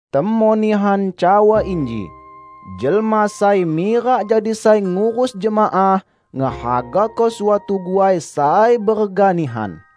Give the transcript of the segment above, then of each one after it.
Temon nihan cawa inji, "Jelma sai mirak jadi sai ngurus jemaah, ngehagako suatu guai sai berega nihan."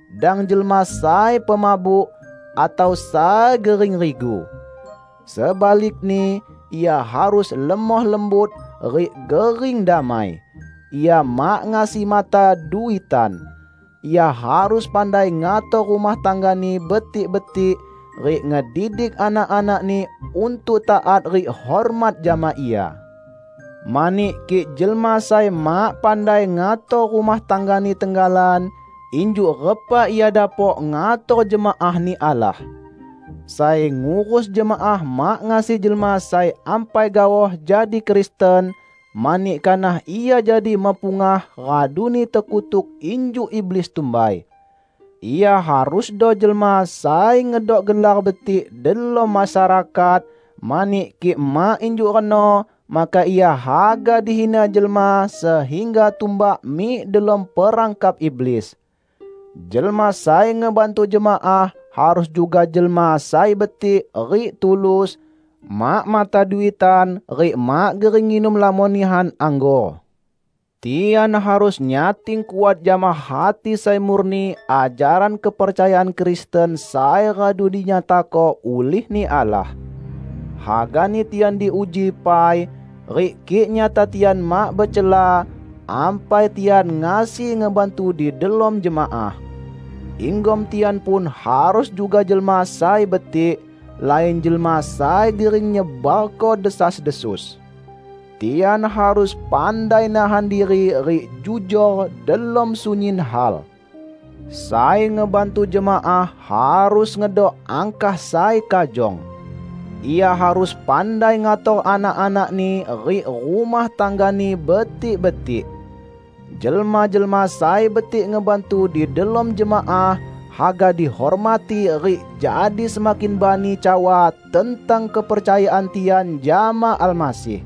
dang jelma sai pemabuk, atau sai gering rigu. Sebalikni, ia harus lemoh lembut rik gering damai. Ia mak ngasi mata duitan. Ia harus pandai ngator rumah tanggani betik-betik, rik ngedidik anak-anakni untuk taat rik hormat jama ia. Mani kik jelma sai mak pandai ngator rumah tanggani tenggalan, injuk repa ia dapok ngator jemaah-Ni Allah? Sai ngurus jemaah mak ngasi jelma sai ampai gaoh jadi Kristen, mani kanah ia jadi mepungah raduni tekutuk injuk iblis tumbai. Ia harusdo jelma sai ngedok gelar betik delom masyarakat, mani kik mak injuk reno maka ia haga dihina jelma sehingga tumbak mik delom perangkap iblis. Jelma sai ngebantu jemaah harus juga jelma sai betik rik tulus; mak mata duitan rik mak gering nginum lamon nihan anggor. Tian harus nyating kuat jama hati sai murni ajaran kepercayaan Kristen sai radu dinyatako ulih-Ni Allah. Hagani tian diuji pai, rik kik nyata tian mak becela, ampai tian ngasi ngebantu di delom jemaah. Inggom tian pun harus juga jelma sai betik, lain jelma sai gering nyebarko desas-desus. Tian harus pandai nahan diri rik jujor delom sunyin hal. Sai ngebantu jemaah harus ngedok angkah sai kajong. Ia harus pandai ngator anak-anakni rik rumah tanggani betik-betik. Jelma-jelma sai betik ngebantu di delom jemaah haga dihormati rik jadi semakin bani cawa tentang kepercayaan tian jama Almasih.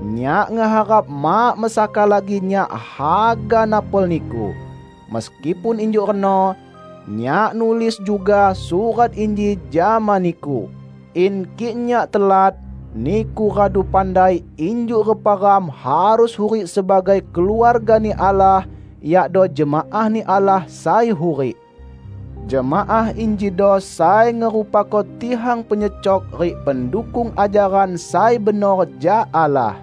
Nyak ngeharap mak mesaka lagi nyak haga napol niku. Meskipun injuk reno, nyak nulis juga surat inji jama niku, in kik nyak telat, niku radu pandai injuk repa ram harus hurik sebagai keluarga-Ni Allah, yakdo jemaah-Ni Allah sai hurik. Jemaah injido sai ngerupako tihang penyecok rik pendukung ajaran sai benor jak Allah.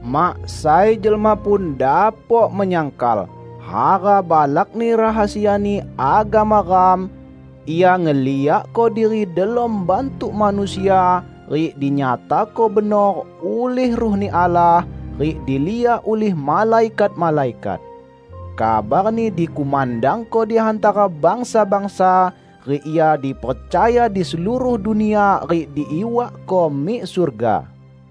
Mak sai jelma pun dapok menyangkal, hara balakni rahasiani agama ram: Ia ngeliakko diri delom bantuk manusia, rik dinyatako benor ulih Ruh-Ni Allah, rik diliak ulih malaikat-malaikat. Kabar-Ni dikumandangko di hantara bangsa-bangsa, rik Ia dipercaya di seluruh dunia rik diiwakko mik surga.